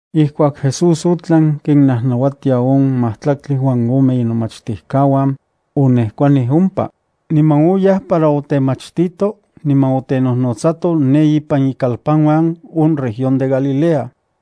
Ijkuak Jesús otlan kinnajnauatia on majtlaktli uan ome inomachtijkauan, onejkuanij ompa, niman oyaj para otemachtito niman otenojnotsato ne ipan ikalpanuan on región de Galilea.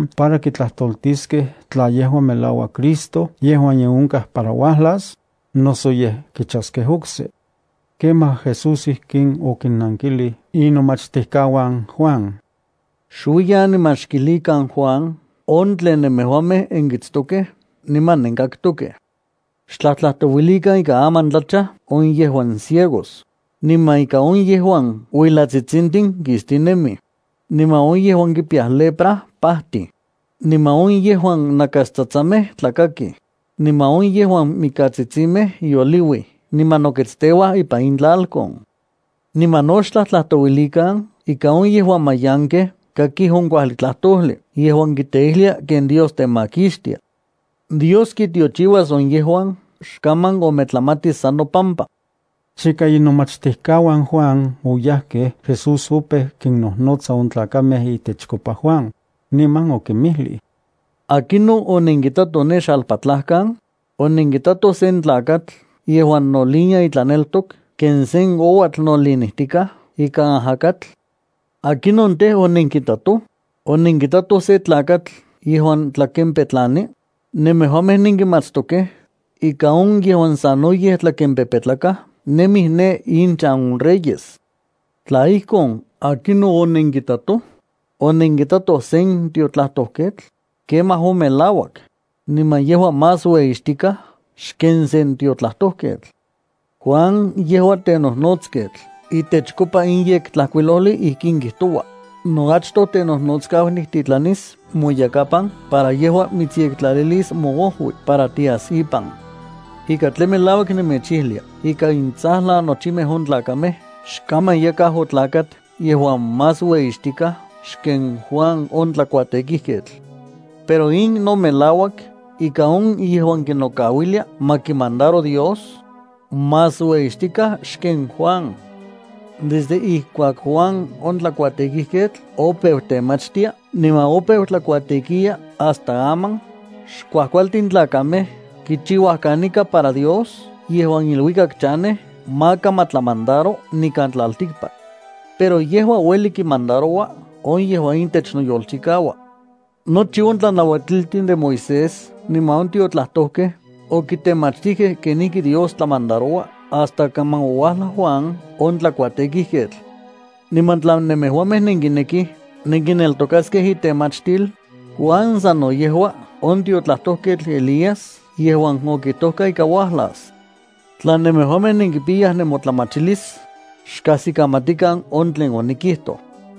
para kitlajtoltiskej tla yejua melauak Cristo yejuan ye onkaj para uajlas, noso yej kichaskej okse. Kemaj Jesús ijkin okinnankilij inomachtijkauan Juan: —Xuiyan niman xkijlikan Juan on tlen nemejuamej nenkitstokej niman nenkaktokej. Xtlajtlajtouilikan ika aman tlachaj on yejuan ciegos, niman ika on yejuan uilatsitsintin kistinemij, niman on yejuan kipiyayaj lepra pajtij, niman on yejuan nakastsatsamej tlakakij, niman on yejuan mikatsitsimej yoliuij niman noketsteuaj ipan intlalkon. Niman no xtlajtlajtouilikan ika on yejuan mayankej kakij on kuajli tlajtojli yejuan kiteijlia ken Dios temakixtia. Dios kitiochiuas on yejuan xkaman ometlamatis san nopampa. Chika inomachtijkauan Juan oyajkej, Jesús opeu kinnojnotsa on tlakamej itechkopa Juan, niman okinmijlij: —¿Akinon onenkitatoj ne xalpatlajkan? ¿Onenkitatoj sen tlakatl yejuan nolinia itlaneltok ken sen ouatl nolinijtikaj ika ajakatl? ¿Akinon tej, onenkitatoj? ¿Onenkitatoj sen tlakatl yejuan tlakenpetlani? Nemejuamej nenkimatstokej ika on yejuan sanoyej tlakempepetlakaj nemij ne inchan on reyes. Tla ijkon, ¿akinon onenkitatoj? ¿Onenkitatoj sen tiotlajtojketl? Kemaj on melauak, niman yejua más ueyixtikaj xken sen tiotlajtojketl. Juan, yejua tenojnotsketl yejuan itechkopa in Yektlajkuilojli ijkin kijtoua: Noachtojtenojnotskau niktitlanis moyakapan para yejua mitsyektlalilis moojui para tias ipan. Ika tlen melauak nemechijlia ika intsajlan nochimej on tlakamej xkaman yakaj otlakat yejuan más ueyixtikaj xken Juan on tlakuatekijketl. Pero in no melauak ika on yejuan kinokauilia ma kimandaro Dios, más ueyixtikaj xken Juan. Desde ijkuak Juan on tlakuatekijketl opeu temachtia niman opeu tlakuatekiya hasta aman, xkuajkualtin tlakamej kichiuaj kanika para Dios yejuan iluikak chanej maka ma tlamandaro nikan tlaltikpak. Pero yejua ueli kinmandaroua on yejuan itech noyolchikauaj. Nochi on tlanauatiltin de Moisés niman on tiotlajtojkej okitemachtijkej kenijki Dios tlamandaroua hasta kaman ouajlaj Juan on tlakuatekijketl. Niman tla nemejuamej nenkinekij nenkineltokaskej intemachtil, Juan sa no yejua on tiotlajtojketl Elías yejuan okijtoka ika uajlas. Tla nemejuamej nenkipiyaj nemotlamachilis, xkajsikamatikan on tlen onikijtoj.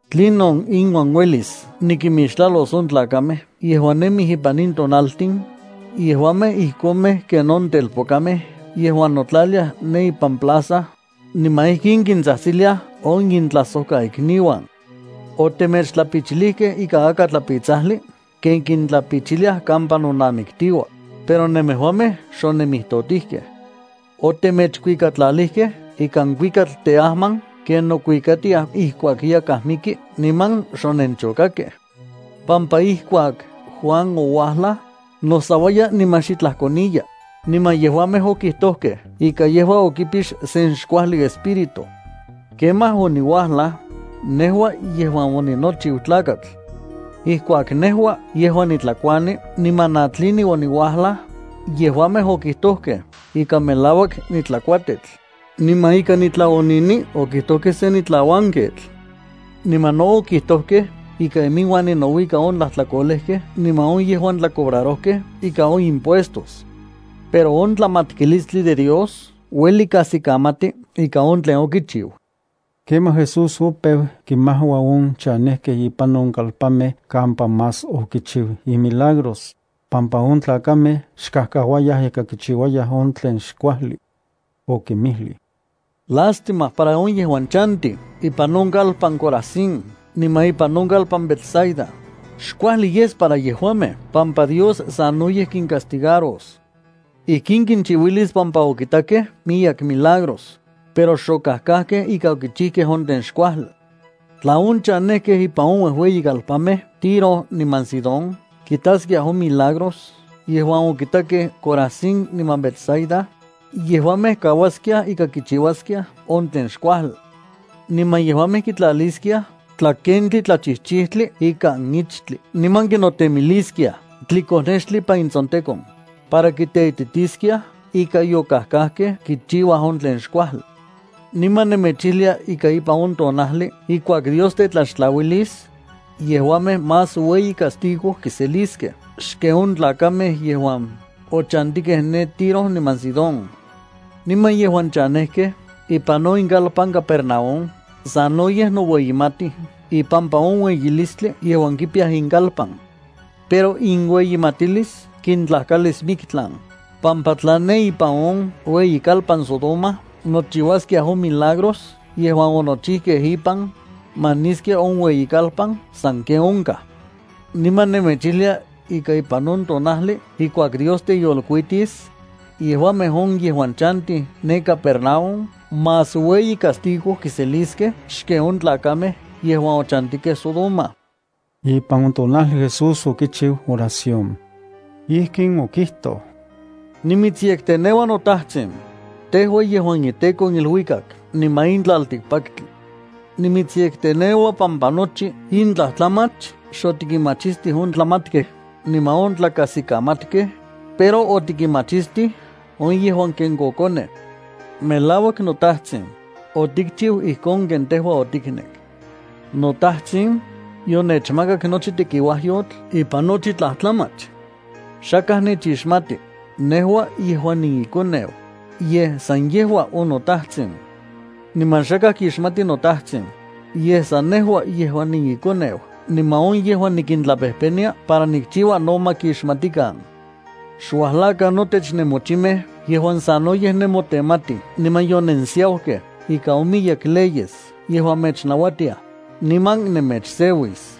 ’¿Tlinon inuan uelis nikimixtlalos on tlakamej yejuan nemij ipan in tonaltin? Yejuamej ijkomej ken on telpokamej yejuan notlaliaj ne ipan plaza, niman ijkin kintsajtsiliaj on intlajsojkaikniuan: “Otemechtlapichilijkej ikan akatlapitsajli ken kintlapichiliaj kampa nonamiktiua, pero nemejuamej xonemijtotijkej. Otemechkuikatlalijkej ikan kuikatl teajman ken nokuikatiaj ijkuak yakaj miki niman xonenchokakkej.” Pampa ijkuak Juan ouajlaj, nosauaya niman xitlaj koniya, niman yejuamej okijtojkej ika yejua okipix sen xkuajli espíritu. Kemaj oniuajlaj, nejua yejuan oninochiu Tlakatl. Ijkuak nejua yejuan nitlakuani niman natlini oniuajlaj, yejuamej okijtojkej ika melauak nitlakuatetl, niman ika nitlaonini, okijtojkej sen nitlauanketl. Niman no okijtojkej ika iminuan ninouika on tlajtlakolejkej niman on yejuan tlacobrarojkej ika on impuestos. Pero on tlamatkilistli de Dios ueli kajskikamati ika on tlen okichiu. Kemaj Jesús opeu kinmajua on chanejkej ipan on kalpanmej kampa más okichiu imilagros, pampa on tlakamej xkajkauayaj ika kichiuayaj on tlen xkuajli. Okinmijlij: —¡Lástima para on yejuan chantij ipan on kalpan Corazín niman ipan on kalpan Betsaida! Xkuajli yes para yejuamej pampa Dios sanoyej kincastigaros. Ijkin kinchiuilis pampa okitakej miyek milagros, pero xokajkajkej ika okichijkej on tlen xkuajli. Tla on chanejkej ipan on uejueyikalpanmej Tiro niman Sidón kitaskiaj on milagros yejuan okitakej Corazín niman Betsaida, yejuamej kauaskiaj ika kichiuaskiaj on tlen xkuajli. Niman yejuamej kitlaliskiaj tlakentli tlachijchijtli ikan ichtli niman kinotemiliskiaj tlikonextli ipan intsontekon, para kiteititiskiaj ika yokajkajkej kichiuaj on tlen xkuajli. Niman nemechijlia ika ipan on tonajli ijkuak Dios tetlaxtlauilis, yejuamej más ueyi castigo kiseliskej xken on tlakamej yejuan ochantikej ne Tiro niman Sidón. Niman yejuan chanejkej ipan on inkalpan Capernaúm sanoyej noueyimatij ipampa on ueyilistli yejuan kipiya inkalpan. Pero inueyimatilis kintlajkalis miktlan, pampa tla ne ipan on ueyikalpan Sodoma nochiuaskiaj on milagros yejuan onochijkej ipan, maniskia on ueyikalpan sanken onkaj. Niman nemechijlia ika ipan on tonajli ijkuak Dios teyolkuitis, yejuamej on yejuan chantij ne Capernaúm más ueyi castigo kiseliskej xken on tlakamej yejuan ochantikej Sodoma. Ipan on tonajli Jesús okichiu oración. Ijkin okijtoj: —Nimitsyekteneua noTajtsin, tejua yejuan iTEKO on iluikak niman in tlaltikpaktli. Nimitsyekteneua pampa nochi in tlajtlamach xotikinmachistij on tlajmatkej niman on tlakajsikamatkej, pero otikinmachistij on yejuan ken kokonej. Melauak noTajtsin, otikchiu ijkon ken tejua otiknek. ’NoTajtsin, yonechmakak nochi tekiuajyotl ipan nochi tlajtlamach. Xakaj nechixmati, nejua yejuan niiKoneu, yej san yejua on noTajtsin. Niman xakaj kixmati noTajtsin, yej san nejua yejuan niiKoneu niman on yejuan nikintlapejpenia para nikchiua no ma kixmatikan. ’Xuajlakan notech nemochimej yejuan sanoyej nemotenmatij niman yonensiaukej ika on miyek leyes yejuan mechnauatiaj, niman nemechseuis.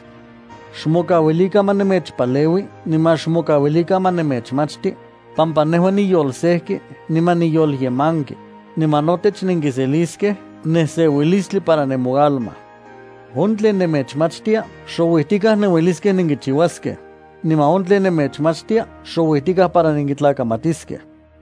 Xmokauilikan ma nemechpaleui niman xmokauilikan ma nemechmachti, pampa nejua niyolsejki niman niyolyemanki, niman notech nenkiseliskej neseuilistli para nemoalma. On tlen nemechmachtia xouijtikaj nenueliskej nenkichiuaskej, niman on tlen nemechnauatia xouijtikaj para nenkitlakamatiskej.